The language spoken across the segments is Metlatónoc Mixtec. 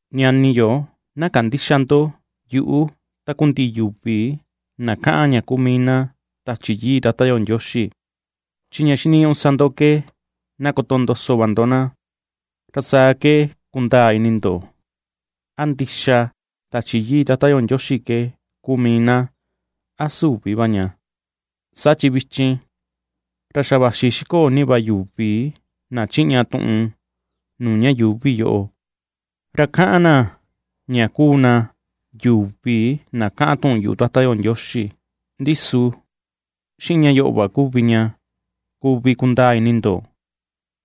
Ñani yo, na kandïxa ndo yuꞌu takundiꞌi yuvi na kaꞌan ña kuu mii na Tachi Yii Tata yo Ndioxi, chi ña xiniñuꞌu sa ndo ke na kotondoso va ndo na, ra saa ke kundaa ini ndo, a ndixa Tachi Yii Tata yo Ndioxi ke kuu mii na, a süvi va ña. Saa chi vichin, ra xa vaxi xikoo ni va yuvi na chiꞌña tuꞌun nuu ña yuuvi yoꞌo, ra kaꞌan na ña kuu na yuvi na kaꞌan tuꞌun yuꞌu Tata yo Ndioxi. Ndi su xiꞌin ña yoꞌo va kuvi ña kuvi kundaa ini ndo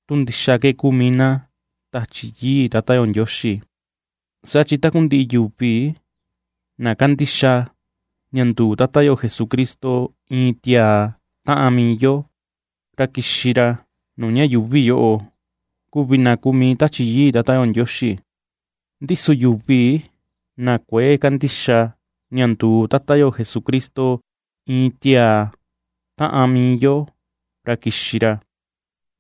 tu ndixa ke kuu mii na Tachi Yii Tata yo Ndioxi: saa chi takundiꞌi yuvi na kandixa ña nduu Tata yo Jesucristo, iin tiaa taꞌan mii yo, ra kixi ra nuu ña yuuvi yoꞌo, kuvi na kuu mii Tachi Yii Tata yo Ndioxi. Ndi su yuvi na kuëe kandixa ña nduu Tata yo Jesucristo iin tiaa taꞌan mii yo, ra kixi ra,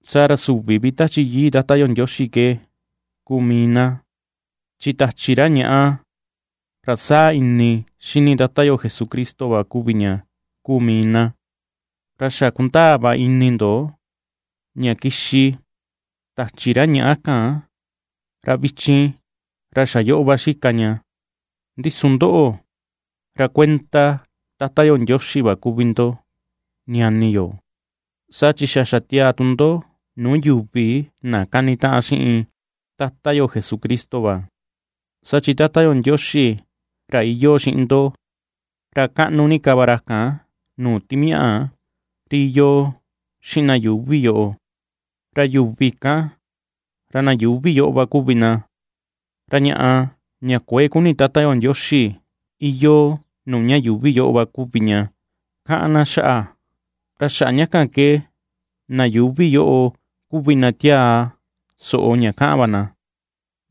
saa ra süvi vi Tachi Yii Tata yo Ndioxi ke kuu mii na. Chi tachi ra ñaꞌa, ra saa ini xini Tata yo Jesucristo va kuvi ña kuu mii na. Ra xa kundaa va ini ndo ña kixi tachi ra ñaꞌa kan; ra vichin, ra xa yoꞌo va xika ña. Ndi su ndoꞌo, ra kuenda Tata yo Ndioxi va kuvi ndo, ñani yo. Saa chi xa xatiaa tu ndo nuu yuvi na kanitaꞌan xiꞌin Tata yo Jesucristo va; saa chi Tata yo Ndioxi ra iyoo xiꞌin ndo, ra kaꞌnu ni ka va ra kan nuu timiaꞌa ri iyoo xiꞌin na yuuvi yoꞌo. Ra yuvi kan, ra na yuuvi yoꞌo va kuvi na, ra ñaꞌa ña kuëe kuni Tata yo Ndioxi, iyoo nuu ña yuuvi yoꞌo va kuvi ña kaꞌan na xaꞌa, ra xaꞌa ña kan ke na yuuvi yoꞌo kuvi na tiaa soꞌo ña kaꞌan va na.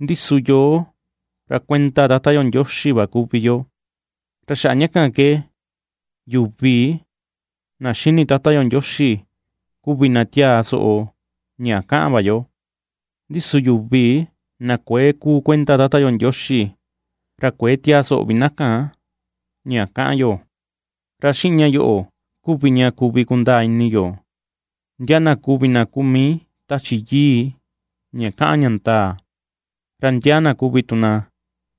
Ndi su yoo, ra kuenda Tata yo Ndioxi va kuvi yo. Ra xaꞌa ña kan ke yuvi na xini Tata yo Ndioxi kuvi na tiaa soꞌo ña kaꞌan va yo; ndi su yuvi na kuëe kuu kuenda Tata yo Ndioxi, ra kuëe tiaa soꞌo vi na kan ña kaꞌan yo. Ra xiꞌin ña yoꞌo kuvi ña kuvi kundaa ini yo, ndia na kuvi kuu mii Tachi Yii ña kaꞌan ña ndaa, ra ndia na kuvi tu na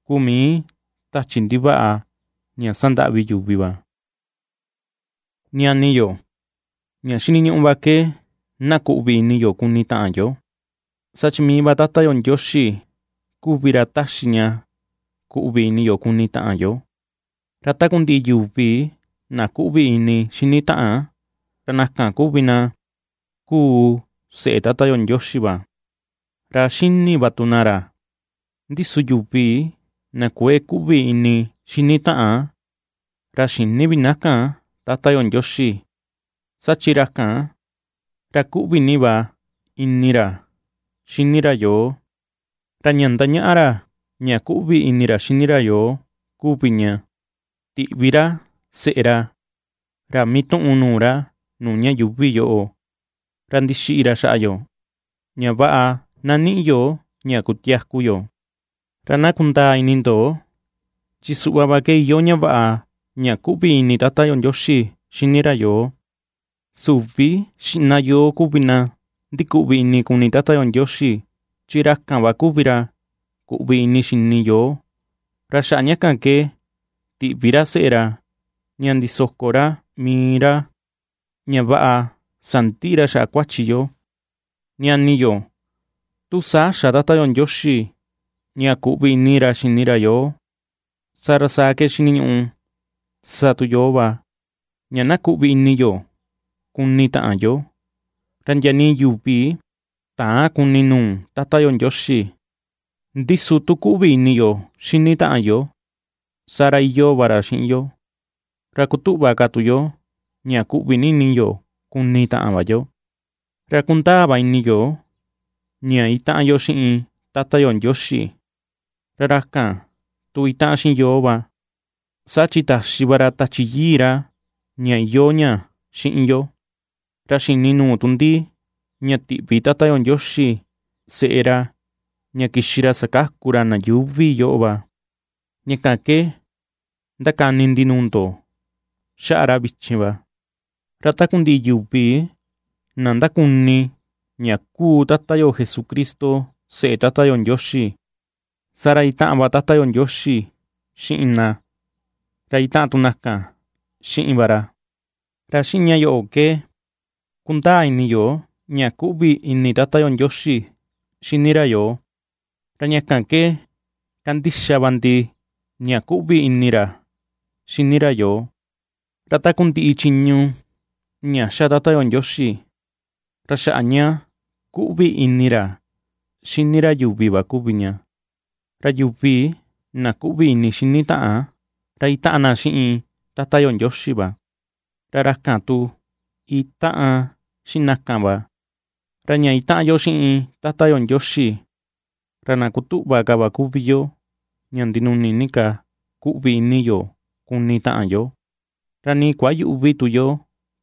kuu mii tachi ndivaꞌa ña sandaꞌvi yuvi va. Ñani yo, ña xiniñuꞌu va ke na kuꞌvi ini yo kuni taꞌan yo, saa chi mii va Tata yo Ndioxi kuvi ra taxi ña kuꞌvi ini yo kuni taꞌan yo. Ra takundiꞌi yuvi na kuꞌvi ini xini taꞌan, ra na kan kuvi na kuu seꞌe Tata yo Ndioxi va, ra xini va tu na ra. Ndi su yuvi na kuëe kuꞌvi ini xini taꞌan, ra xïni vi na kan Tata yo Ndioxi, saa chi ra kan, ra kuꞌvi ni va ini ra xini ra yoo. Ra ña ^ndañaꞌa ra ña kuꞌvi ini ra xini ra yoo kuvi ña, tiꞌvi ra seꞌe ra, ra mituꞌun nuu ra nuu ña yuuvi yoꞌo; ra ndixiꞌi ra xaꞌa yo ña vaꞌa na niꞌi yo ña kutiaku. Ra na kundaa ini ndo, chi suꞌva va ke iyoo ña vaꞌa kuꞌvi ini Tata yo Ndioxi xini ra yoo: süvi xiꞌna yoo kuvi na ndikuꞌvi ini kuni Tata yo Ndioxi, chi ra kan va kuvi ra kuꞌvi ini xini yoo, ra xaꞌa ña kan ke tiꞌvi ra seꞌe ra ña ndisoko ra mii ra, ña vaꞌa sandiꞌi ra xaꞌa kuachi yo. Ñani yo, tu saa xa Tata yo Ndioxi ña kuꞌvi ini ra xini ra yoo, saa ra saa ke xiniñuꞌu na sa tu yoo va ña na kuꞌvi ini yo kuni taꞌan yo. Ra ndia nii yuvi täan kuni nuu Tata yo Ndioxi, ndi su tu kuꞌvi ini yo xini taꞌan yo, saa ra iyoo va ra xiꞌin yo, ra kutuꞌva ka tu yo ña kuꞌvi ni ini yo kuni taꞌan va yo. Ra kundaa va ini yo ña itaꞌan yo xiꞌin Tata yo Ndioxi, ra ra kan tu itaꞌan xiꞌin yoo va, saa chi taxi va ra Tachi Yii ra ña iyoo ña xiꞌin yo. Ra xini nuu tu ndi ña tiꞌvi Tata yo Ndioxi seꞌe ra ña kixi ra sakaku ra na yuuvi yoꞌo va, ña kan ke ndakani ndi nuu ndo xaꞌa ra vichin va. Ra takundiꞌi yuvi na ndakuni ña kuu Tata yo Jesucristo seꞌe Tata yo Ndioxi, saa ra itaꞌan va Tata yo Ndioxi xiꞌin na, ra itaꞌan tu na kan xiꞌin va ra. Ra xiꞌin ña yoꞌo ke, kundaa ini yo ña kuꞌvi ini Tata yo Ndioxi xini ra yoo, ra ña kan ke kandixa va ndi ña kuꞌvi ini ra xini ra yoo. Ra takundiꞌi chiñu ña xa Tata yo Ndioxi, ra xaꞌa ña kuꞌvi ini ra xini ra yuvi va kuvi ña; ra yuvi na kuꞌvi ini xini taꞌan, ra itaꞌan na xiꞌin Tata yo Ndioxi va, ra ra kan tu itaꞌan xiꞌin na kan va. Ra ña itaꞌan yo xiꞌin Tata yo Ndioxi, ra na kutuꞌva ka va kuvi yo ña ndinuni ni ka kuꞌvi ini yo kuni taꞌan yo, ra nii kuayüꞌvi tu yo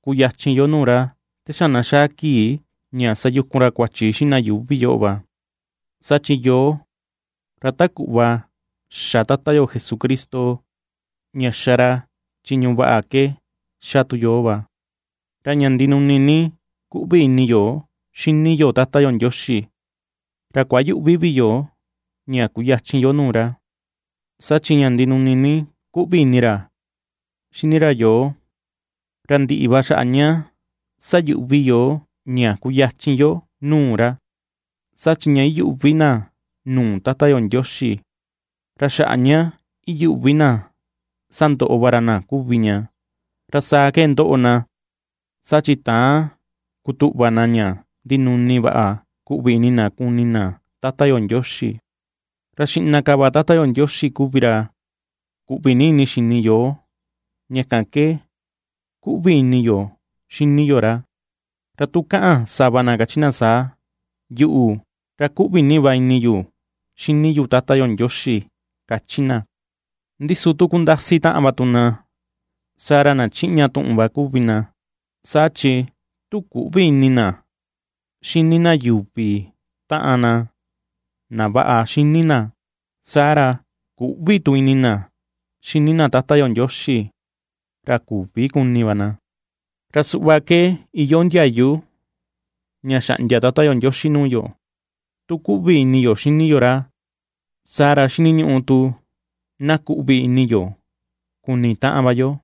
kuyachin yo nuu ra te xa na xaa kii ña sayukun ra kuachi xiꞌin na yuuvi yoꞌo va; saa chi yoo ra ta kuꞌva xa Tata yo Jesucristo, ña xa ra chiñu vaꞌa ke xa tu yoo va. Ra ña ndinuni ni kuꞌvi ini yo xini yo Tata yo Ndioxi, ra kuayüꞌvi vi yo ña kuyachin yo nuu ra, saa chi ña ndinuni ni kuꞌvi ini ra xini ra yoo, ra ndiꞌi va xaꞌa ña sayuꞌvi yoo ña kuyachin yo nuu ra. Saa chi ña iyuꞌvi na nuu Tata yo Ndioxi, ra xaꞌa ña iyuꞌvi na sandoꞌo va ra na kuvi ña. Ra saa ke ndoꞌo na, saa chi täan kutuꞌva na ña ndinuni vaꞌa kuꞌvi ini na kuni na Tata yo Ndioxi. Ra xiꞌna ka va Tata yo Ndioxi kuvi ra kuꞌvi ni ini xini yoo, ña kan ke kuꞌvi ini yo xini yo ra. Ra tu kaꞌan sava na kachi na saa: “Yuꞌu, ra kuꞌvi ni va ini yu xini yu Tata yo Ndioxi”, kachi na, ndi su tu kundasi taꞌan va tu na, saa ra na chiꞌña tuꞌun va kuvi na. Saa chi tu küꞌvi ini na xini na yuvi taꞌan na na vaꞌa xini na, saa ra küꞌvi tu ini na xini na Tata yo Ndioxi, ra küvi kuni va na. Ra suꞌva ke iyoo ndiayu ña xaꞌndia Tata yo Ndioxi nuu yo: Tu kuꞌvi ini yo xini yo ra, saa ra xiniñuꞌu tu na kuꞌvi ini yo kuni taꞌan va yo.